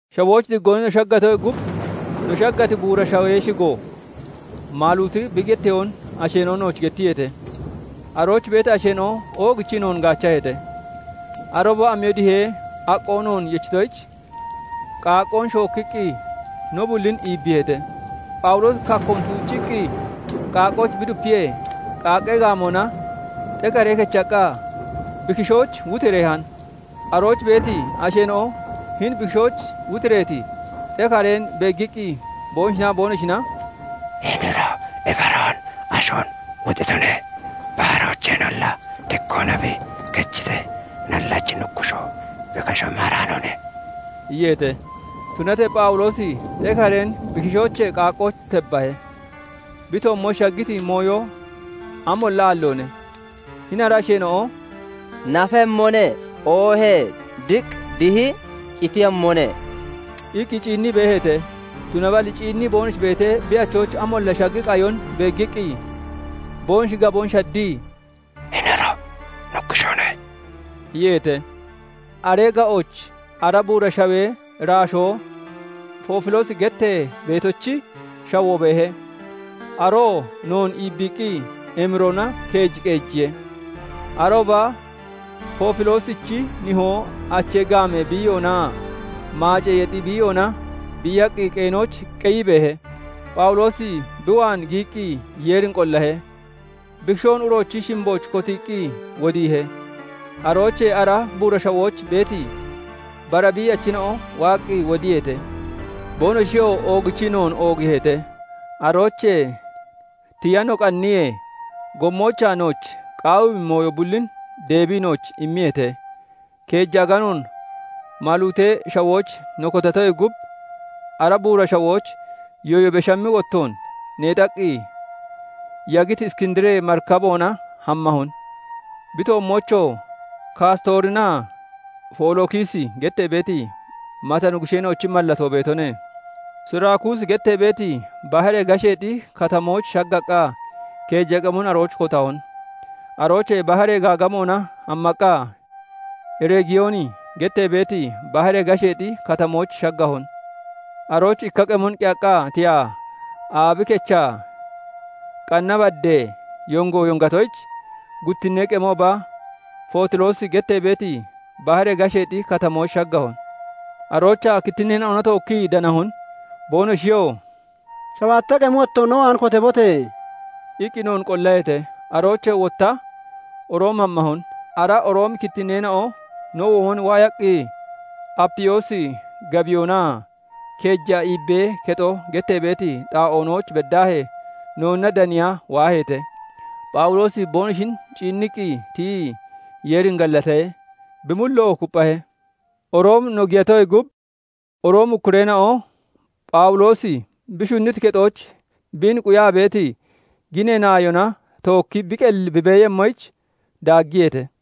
Shawooch diggoona no shaggatoyee gub no shaggati buura shawee shigo Maaluuti bi getteyoon asheena'o nooch gettiyeete. Arooch beeti asheena'o oogichii noon gaachaheete; arooba amiyo dihee aqqoo noon yechitoyich, qaaqqoon shookkiqqi no bullin iibbiiheete. Phawuloosi kaakkoon tuucciqqi qaaqqooch bi dupiyee, qaaqqee gaamoona xekare kechaqqa bi kishooch wotireehan. Arooch beeti asheena'o hini bi kishooch wutireeti xekareen beeggiqqi, boonoshinaa boonoshina "Hini uro ibaroon ashoon wuxitone; baharoocheenolla diggoona bi kechitee, nallachi nuggushoo bi kashoon maaraanoone" iyeete. Tunatee Phawuloosi xekareen bi kishoochee qaaqqooch tebbahe; bi toommooch shaggiti mooyo amolla aalloone. Hini ara asheena'o "Nafemmone; oohee diq dihi qitemmone" iqqi ciinnii beeheete. Tunaballi ciinnii boonoshi beetee, bi achooch amolla shaggi qayon beeggiqqi boonoshi gaboon shaddii, "Hini uro nuggushoone" iyeete. Aree ga'ooch ara buura shawee iraashoo Foofiloosi gettee beetochi shawoo beehe. Aroo noon iibbiiqqi emiroona keej qeejiye. Arooba Foofiloosichi nihoo achee gaamee biiyoonaa maacee yexi biiyoona biiyaqqi qeenooch qeyii beehe. Phawuloosi bi waan giyiqqi Yeerin qollahe; bi kishoon uroochi shimbooch kotiiqqi wodiihe. Aroochee ara buura shawooch beeti bara biiyachina'o waaqqi wodiyeete. Boonoshiyoo oogichii noon oogiiheete; aroochee tiya no qanniyee, gommoochaa nooch qaawiimmi mooyo bullin deebii nooch immiyeete. Keeja aganoon Maaluutee Shawooch no kotatoyee gub, ara buura shawooch yooyo beshammi wottoon neexaqqi yagiti Iskindiree marikaboona hammahon; bi toommoochoo Kaastoorinaa Folookisi gettee beeti mata nuggusheena'ochi mallatoo beetone. Suraakuusi gettee beeti baharee gasheexi katamooch shaggaqqa keeja qemon arooch kotahon. Aroochee baharee gaagamoona hammaqqa Reegiyooni gettee beeti baharee gasheexi katamooch shaggahon. Arooch ikka qemon qeyaqqa tiyaa aabi kechaa qanna baddee yongo yongatoyich, guttinnee qemooba Fotiloosi gettee beeti baharee gasheexi katamooch shaggahon. Aroochaa kittinneena'ona tookkii danahon. Boonoshiyoo "Shabaatta qemi wottoon no waan kotabote!" iqqi noon qollaheete. Aroochee wotta Room hammahon. Ara Roomi kittinneena'o no womon waayaqqi Apiyoosi gabiyoonaa Keeja Iibbee Kexo gettee beeti xaa'oonooch beddaahee noonna daniya waaheete. Phawuloosi boonoshin ciinniqqi tiyii, Yeerin gallatahe; bi mulloo kupphahe. Room no giyatoyee gub, Roomi ukkureena'o Phawuloosi bi shunniti kexooch biin quyaa beeti ginee naayona tookki bi qelli bi beeyemmoyich daaggiyeete.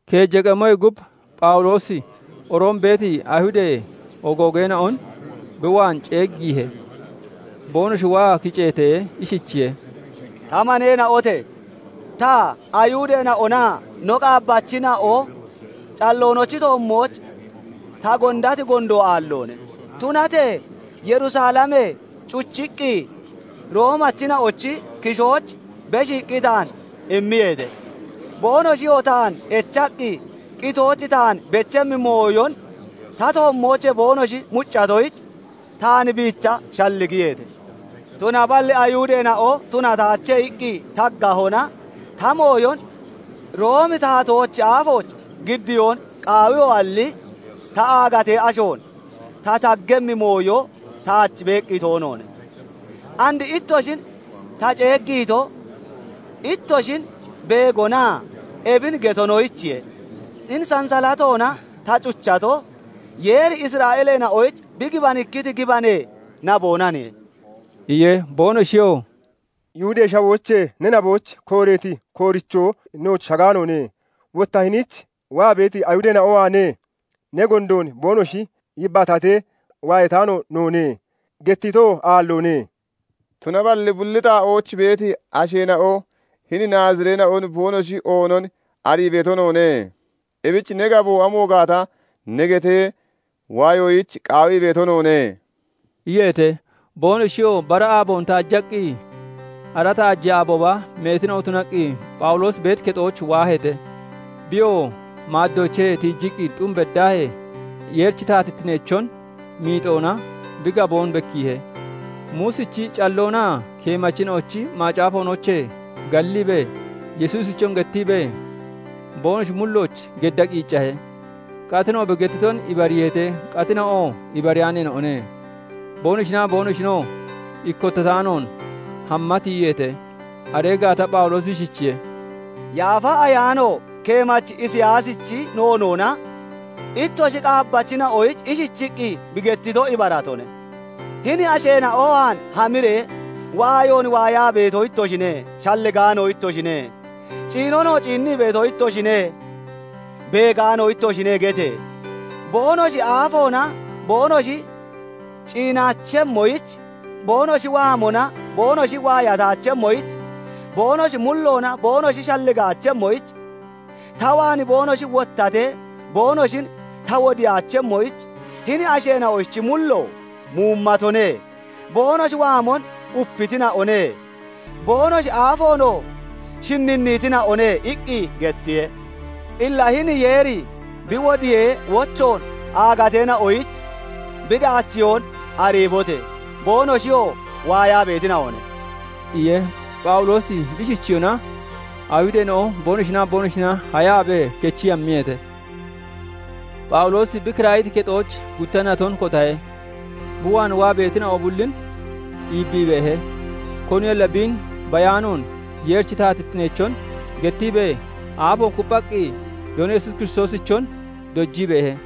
Keeja qemoyee gub, Phawuloosi Room beeti Ayihudee ogoogeena'on bi waan ceeggiihe. Boonoshi waa kiceetee, ishichiye:- "Ta maneena'ote! Ta, Ayihudeena'onaa no qaabbachina'o calloonochi toommooch ta gondati gondo aalloone; tunatee Yerusalemee cuchiqqi Roomachina'ochi kishooch beshiiqqi taan immiyeete. Boonoshiyoo taan echaqqi qitooch taan bechimmi mooyon ta toommoochee boonoshi muccatoyich, taan biicha shalligiyeete; tunaballi Ayihudeena'o 'Tunataache' iqqi taggahona, ta mooyon Roomi taatoochi aafooch giddiyoon qaawiyoalli, ta aagatee ashoon ta taggemmi mooyo taach beeqqi toonoone. And ittoshin ta ceeggiito, ittoshin beegonaa ebin getonoyichiye; hini sansalatoona ta cuchato, Yeeri Isra'eeleena'oyich bi gibanikkiti gibanee naboonaniye" iye. Boonoshiyoo "Yihudee Shawoochee ne naboyich kooreeti koorichoo nooch shagaanoone. Wotta hiniich waa beeti Ayihudeena'o waanee ne gondoon boonoshi yibbaatatee waayataano noone; gettitoo aalloone. Tunaballi bulli xaa'ooch beeti asheena'o hini Naazireena'on boonoshi oonon arii beeto noone. Ebich ne gaboo amo gaata ne getee waayoyich qaawii beeto noone" iyeete. Boonoshiyoo bara aaboon taajaqqi, ara taajee aabooba meetina'o tunaqqi Phawuloosi beeti kexooch waaheete. Biyoo maaddoochee tiijiqqi xum beddaahee, Yeerichi taatittineechon miixoona bi gaboon bekkiihe; Muusichi calloonaa keemachina'ochi macaafoonoochee galliibee, Yesuusichon gettiibee, boonoshi mullooch gedda qiiccahe. Qatina'o bi gettiton ibariiheete; qatina'oo ibariyaaneena'one. Boonoshinaa boonoshinoo ikkottataanoon hamma tiyiyeete. Aree gaata Phawuloosi ishichiye:- "Yaafa Ayaano keemachi Isiyaasichi noonoona ittoshi qaabbachina'oyich ishichiqqi bi gettito ibaratone:- 'Hini asheena'o waan hamiree, "Waayoon waayaa beeto ittoshine; shalligaano ittoshine; ciinonoo ciinnii beeto ittoshine; beegaano ittoshine" gete! Boonoshi aafoona boonoshi ciinaachemmoyich, boonoshi waamona boonoshi waayataachemmoyich, boonoshi mulloona boonoshi shalligaachemmoyich, ta waan boonoshi wottatee boonoshin ta wodiyaachemmoyich, hini asheena'ochi mullo muumatone; boonoshi waamon upitina'one; boonoshi aafoonoo shinninniitina'one' iqqi gettiye. "Illa hini Yeeri bi wodiyee wochoon aagateena'oyich bi daachiyoon ariibote! Boonoshiyoo waayaa beetina'one" iye. [Phaawuloosi bi ishichiyona Ayihudeena'o boonoshinaa boonoshina hayaabee kechii hammiyeete.] Phawuloosi bi kiraayiti kexooch gutta naton kotahe; bi waan waa beetina'o bullin iibbii beehe. Koniyolla biin bayaanoon Yeerichi taatittineechon gettiibee, aafoon kupphaqqi Doono Yesuus Kiristoosichon dojii beehe.